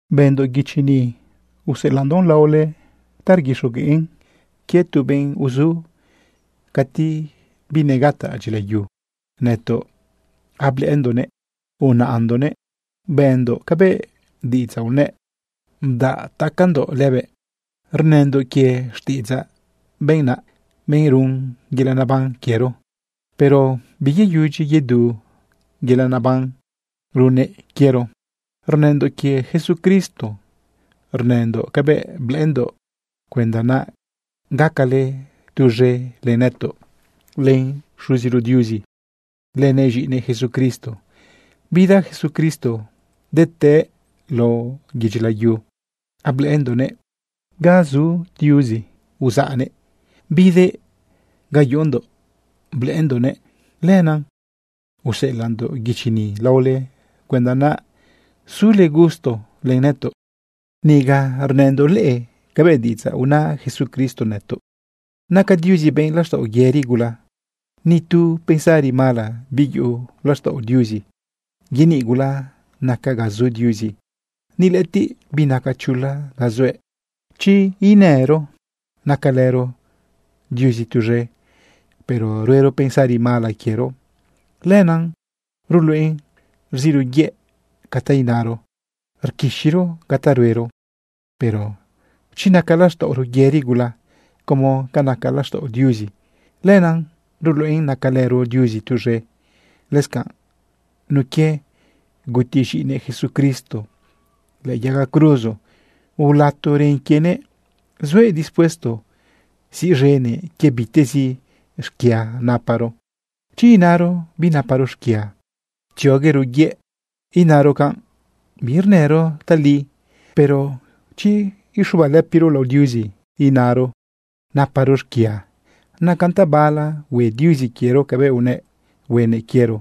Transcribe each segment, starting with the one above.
Bëndoꞌ guichi ni useꞌelaꞌndoꞌn laole rguixogueꞌn quie tu benꞌ uzu cati binegataꞌ dyilayu. Nëtoꞌ ablëꞌëndoꞌnëꞌ, unaꞌndoꞌnëꞌ, bendoꞌ cabëꞌ diꞌidzaꞌ unëꞌ, udaꞌ tacandoꞌ lëbëꞌ. Rnëndoꞌ quie xtiꞌidzaꞌ benꞌ naꞌ, benꞌ run yelaꞌ naban quiero, pero biyeyudyi yedu yelaꞌ neban runnëꞌ quiero. Rnëndoꞌ quie Jesucristo. Rnëndoꞌ cabëꞌ blëꞌëndoꞌ cuenda naꞌ gacale tuz̃e len nëtoꞌ, len Xuziro Diuzi, lënëꞌ z̃iꞌinëꞌ Jesucristo. Bida Jesucristo detëꞌë lao yedyi layu ablëꞌëndoꞌnëꞌ. Ga zu Diuzi uzaꞌnëꞌ bidëꞌ ga yuꞌundoꞌ blëꞌëndoꞌnëꞌ. Lenaꞌ useꞌelaꞌndoꞌ guichi ni laole cuenda naꞌ sule gusto len nëtoꞌ. Niga rnëndoꞌ leꞌe cabëꞌ diꞌidzaꞌ una Jesucristo nëtoꞌ. Naca Diuzi benꞌ laxtaꞌo yëri gula. Ni tu pensari mala biyuꞌu laxtaꞌo Diuzi. Yeniꞌ gula naca ga zu Diuzi. Ni lëꞌëtiꞌ binaca chula ga zuëꞌ. Chi inëro nacalëro Diuzi tuz̃e, pero ruero pensari mala quiero, lenaꞌ ruluꞌen rziꞌro yëꞌ ca ta inaro, rquixiro ca ta ruero. Pero chi naca laxtaꞌoro yëri gula como naca laxtaꞌo Diuzi, lena ruluꞌen nacalëro Diuzi tuz̃e. Lëscanꞌ, nun quie guti z̃iꞌinëꞌ Jesucristo lëꞌë yaga cruzo ulato ren quienëꞌ, zuëꞌ dispuesto siꞌz̃enëꞌ quie bitezi xquia naparo. Chi inaro binaparo xquia, tzioguero yëꞌ inaro canꞌ, birnëro tali. Pero chi uxubalëpiro lao Diuzi inaro naparo xquia, nacan tabala hue Diuzi quiero cabëꞌ unëꞌ huenëꞌ quiero,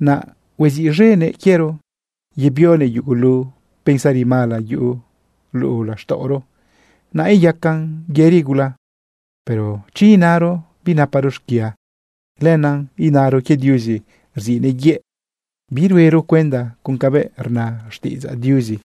naꞌ huaziꞌz̃enëꞌ quiero yebionëꞌ yugulu pensari mala yuꞌu luꞌu laxtaꞌoro, naꞌ iyacan yëri gula. Pero chi inaro binaparo xquia, lenaꞌ inaro quie Diuzi rziꞌnëꞌ yëꞌ, biruero cuenda con cabëꞌ rna xtiꞌidzaꞌ Diuzi.